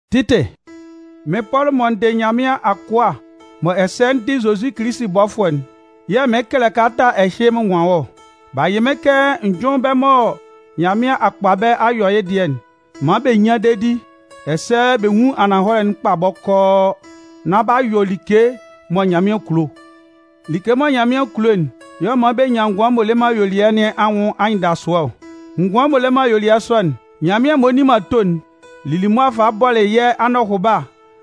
Titi, Mɩ́n Pɔlʋ mɔ n dɩ Nyanmɩan akʋa mɔ ɛsɛ n dɩ Zozi Kilisi bɔfʋɛ'n yɛ̂ mɩɩn kɛlɛ kalata ɛhɩ mɩn nwan wɔ́ ɔ. B'a yɩ mɩ́n kɛ n jʋ́ɩn bɛ́ mɔ Nyanmɩan a kpa bɛ́ a yɔ yɩ́ dɩɛ'n maan bɛ nyán dedi, ɛsɛ bɛ nwún ananhɔlɛ'n kpa bɔkɔɔ nán b'a yɔ like mɔ Nyanmɩan kulo. Like mɔ Nyanmɩan kulo'n y'ɔ man bɛ nyan ngʋan m'ɔ le man ayuelɩɛ nɩn anwʋn anyɩndasʋɛ ɔ. Ngʋan m'ɔ le man ayuelɩɛ sɔ'n, Nyanmɩan m'ɔ nni man ato'n lili mʋa falɩ bɔlɩ yɛ́ anɔhʋba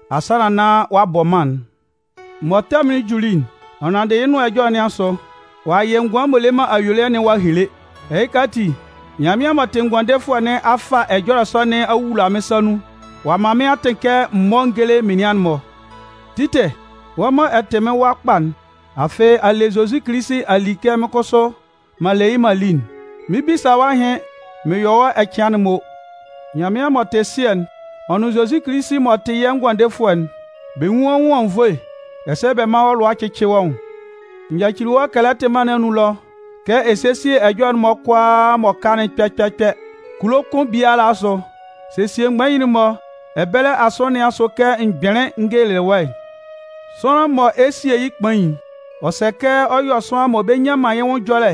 asannan nán ɔ'a bɔ mân'n. Mɔ tɛmʋn'n juli'n, ɔ nanndɩ yɩ́ Nʋan Ɛjɔlɛ nɩn asʋ, ɔ'a yɩ́ ngʋan m'ɔ le man ayuelɩɛ'n ɔ'a hele. Ɛhɩka ati, Nyanmɩan m'ɔ tɩ Ngʋandefʋɛ nɩn a fa ɛjɔlɛ sɔ nɩn a wula mɩ́n sa nun ɔ'a man mɩ́n atɩn kɛ m mɔ́ n géle menian'n-mɔ. Titɩ, wɔ́ mɔ ɛ tɩ mɩ́n wa kpa'n, afɩ a le Zozi Kilisi a li kɛ mɩ́n kʋsʋ m'an le yɩ́ m'an li'n, mɩn 'bisa wɔ́ ahɩn mɩn yɔ wɔ́ ɛcɩan'n mɔ. Nyanmɩan m'ɔ tɩ Sɩɛ'n ɔ nʋn Zozi Kilisi m'ɔ tɩ yɛ́ Ngʋandefʋɛ'n, bɛ nwún wɔ́ nwʋn anwunnvoe ɛsɛ bɛ mán wɔ́ lʋa cɩ́cɩ wɔ́ nwʋn. N yacili wɔ́ Kɛlɛtɩ mân nɩn anun ɛlɔ kɛ ɛ sésie ɛjɔlɛ'n kʋalaa m'ɔ ka'n kpɛ kpɛ kpɛ. Kulo kʋn biala asʋ, sesie mgbain-mɔ ɛbɛlɛ asɔnɩn nɩn asʋ kɛ m gbɩnlɩn n gelelɩ wɔ́'n. Sʋanlan mɔ ɛ 'sie yɩ́ kpain'n, ɔ sɛ kɛ ɔ yɔ́ sʋanlan mɔ bɛ nnyan man yɩ́ nwʋn ɛjɔlɛ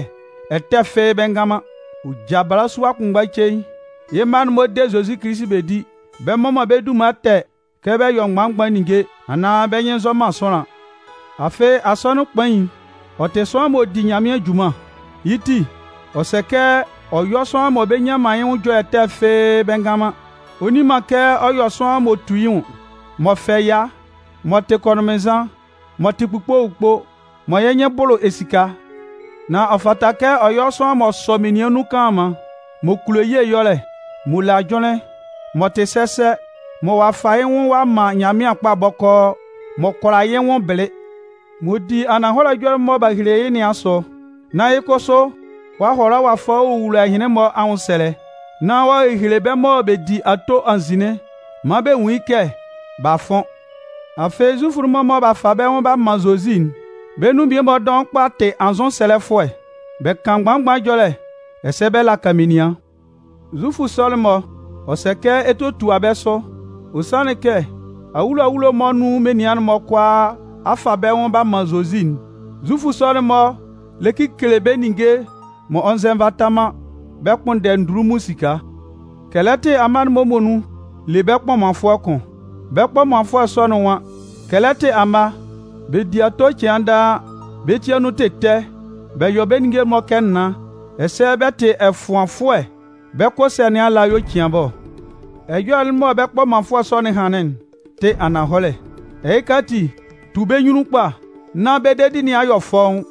ɛtɛ fɩ́ɩ́ bɛ ngan man. Ɔ ja balasua kʋnmgba cein, yɩ́ mma'n-mɔ de Zozi Kilisi bɛ di, bɛ mmɔ man bɛ́ dunman ɛtɛ kɛ bɛ yɔ mgban-mgban ninnge anaan bɛ́ nyɩn nzɔ man sʋanlan. Afɩ asɔnɩn kpain'n, ɔ tɩ sʋanlan m'ɔ di Nyanmɩan junman. Yɩ́ ti, ɔ sɛ kɛ ɔ yɔ́ sʋanlan mɔ bɛ nnyan man yɩ́ nwʋn ɛjɔlɛ ɛtɛ fɩ́ɩ́ bɛ ngan man. Ɔ nni man kɛ ɔ yɔ sʋanlan m'ɔ tu yɩ́ nwʋn, m'ɔ fɛ ɛya, m'ɔ tɩ kɔnʋnmɩnnzan, m'ɔ tɩ kpukpo kpukpo, mɔ yɩ́ nyɩn bʋlʋ esika. Nan ɔ fata kɛ ɔ yɔ sʋanlan m'ɔ sɔ menian nun kanlanman, m'ɔ kulo ye ɛyɔlɛ, m'ɔ le ajʋnlɩn, m'ɔ tɩ sɛsɛ, mɔ ɔ'a fa yɩ́ nwʋn ɔ'a man Nyanmɩan kpa bɔkɔɔ, m'ɔ kʋala yɩ́ nwʋn bɩlɩ, m'ɔ di ananhɔlɛ ɛjɔlɛ'n mɔ b'a hehele yɩ́ nɩn asʋ, nán yɩ́ kʋsʋ ɔ'a hʋala ɔ'a fa ɔ'a wowula ɛhɩnlɩn-mɔ anwʋnsɛlɛ, nán ɔ'a hele bɛ́ mɔ bɛ di ato nzin'n maan bɛ nwun yɩ́ kɛ b'a fʋn. Afɩ, Zufʋ'n-mɔ mɔ b'a fa bɛ́ nwʋn b'a man Zozi'n, bɛ́ nun mmie-mɔ dɔʋn kpa tɩ anzʋsɛlɛfʋɛ, bɛ kan mgban-mgban ɛjɔlɛ ɛsɛ bɛ laka menian. Zufʋ sɔ'n-mɔ, ɔ sɛ kɛ ɛ tótua bɛ́ sʋ. Ɔ sanlɩn kɛ, awulo awulo mɔ nun menian'n-mɔ kʋalaa a fa bɛ́ nwʋn b'a man Zozi'n, Zufʋ sɔ'n-mɔ lɛ kekele bɛ́ ninnge m'ɔ nzɛ nvata man bɛ kpʋnndɛ ndunlunmun esika. Kɛlɛtɩ amma'n-mɔ muonun le bɛ́ kpɔmanfʋɛ kʋn. Bɛ́ kpɔmanfʋɛ sɔ'n nwan: Kɛlɛtɩ amma, bɛ di ato cɩan daa, bɛ́ ti anun tɩ ɛtɛ bɛ yɔ bɛ ninnge'n-mɔ kɛ naan, ɛsɛ bɛ tɩ ɛfʋanfʋɛ bɛ́ kʋ ɛsɛ̂ nɩn ala y'ɔ cian bɛ́ ɔ. Ɛjɔlɛ'n mɔ bɛ́ kpɔmanfʋɛ sɔ'n hanlɩn'n tɩ ananhɔlɛ. Ɛhɩka ati, tu bɛ́ nyunnun kpa, nán bɛ́ dedi nɩn a yɔ fɔ́ʋ́n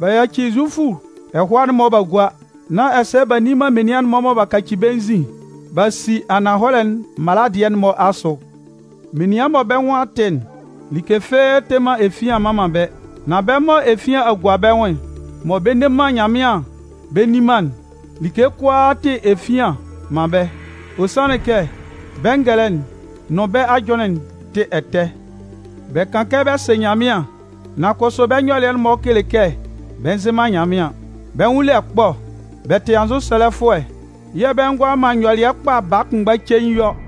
b'a yaci Zufʋ ɛhʋa'n-mɔ b'a gua, nán ɛsɛ b'a nni man menian mɔ b'a kaci bɛ́ nzin b'a si ananhɔlɛ'n mala dɩɛ'n-mɔ asʋ. Menian mɔ bɛ́ nwʋn a tɩ'n, like fɩ́ɩ́ tɩ man efian mman man bɛ́. Nan bɛ́ mɔ efian a gua bɛ́ nwʋn mɔ bɛ nne man Nyanmɩan bɛ nni man'n, like kʋalaa tɩ efian man bɛ́. Ɔ sanlɩn kɛ bɛ́ ngɛlɛ'n nʋn bɛ́ ajʋnlɩn'n tɩ ɛtɛ. Bɛ kan kɛ bɛ sɩ Nyanmɩan, nan kʋsʋ bɛ́ nyɔlɩɛ'n-mɔ kele kɛ bɛ nzɩ man Nyanmɩan. Bɛ́ nwʋn le ɛkpɔ, bɛ tɩ anzʋsɛlɛfʋɛ yɛ̂ bɛ ngʋala man nyɔlɩɛ kpa baa kʋnmgba cein yɔ.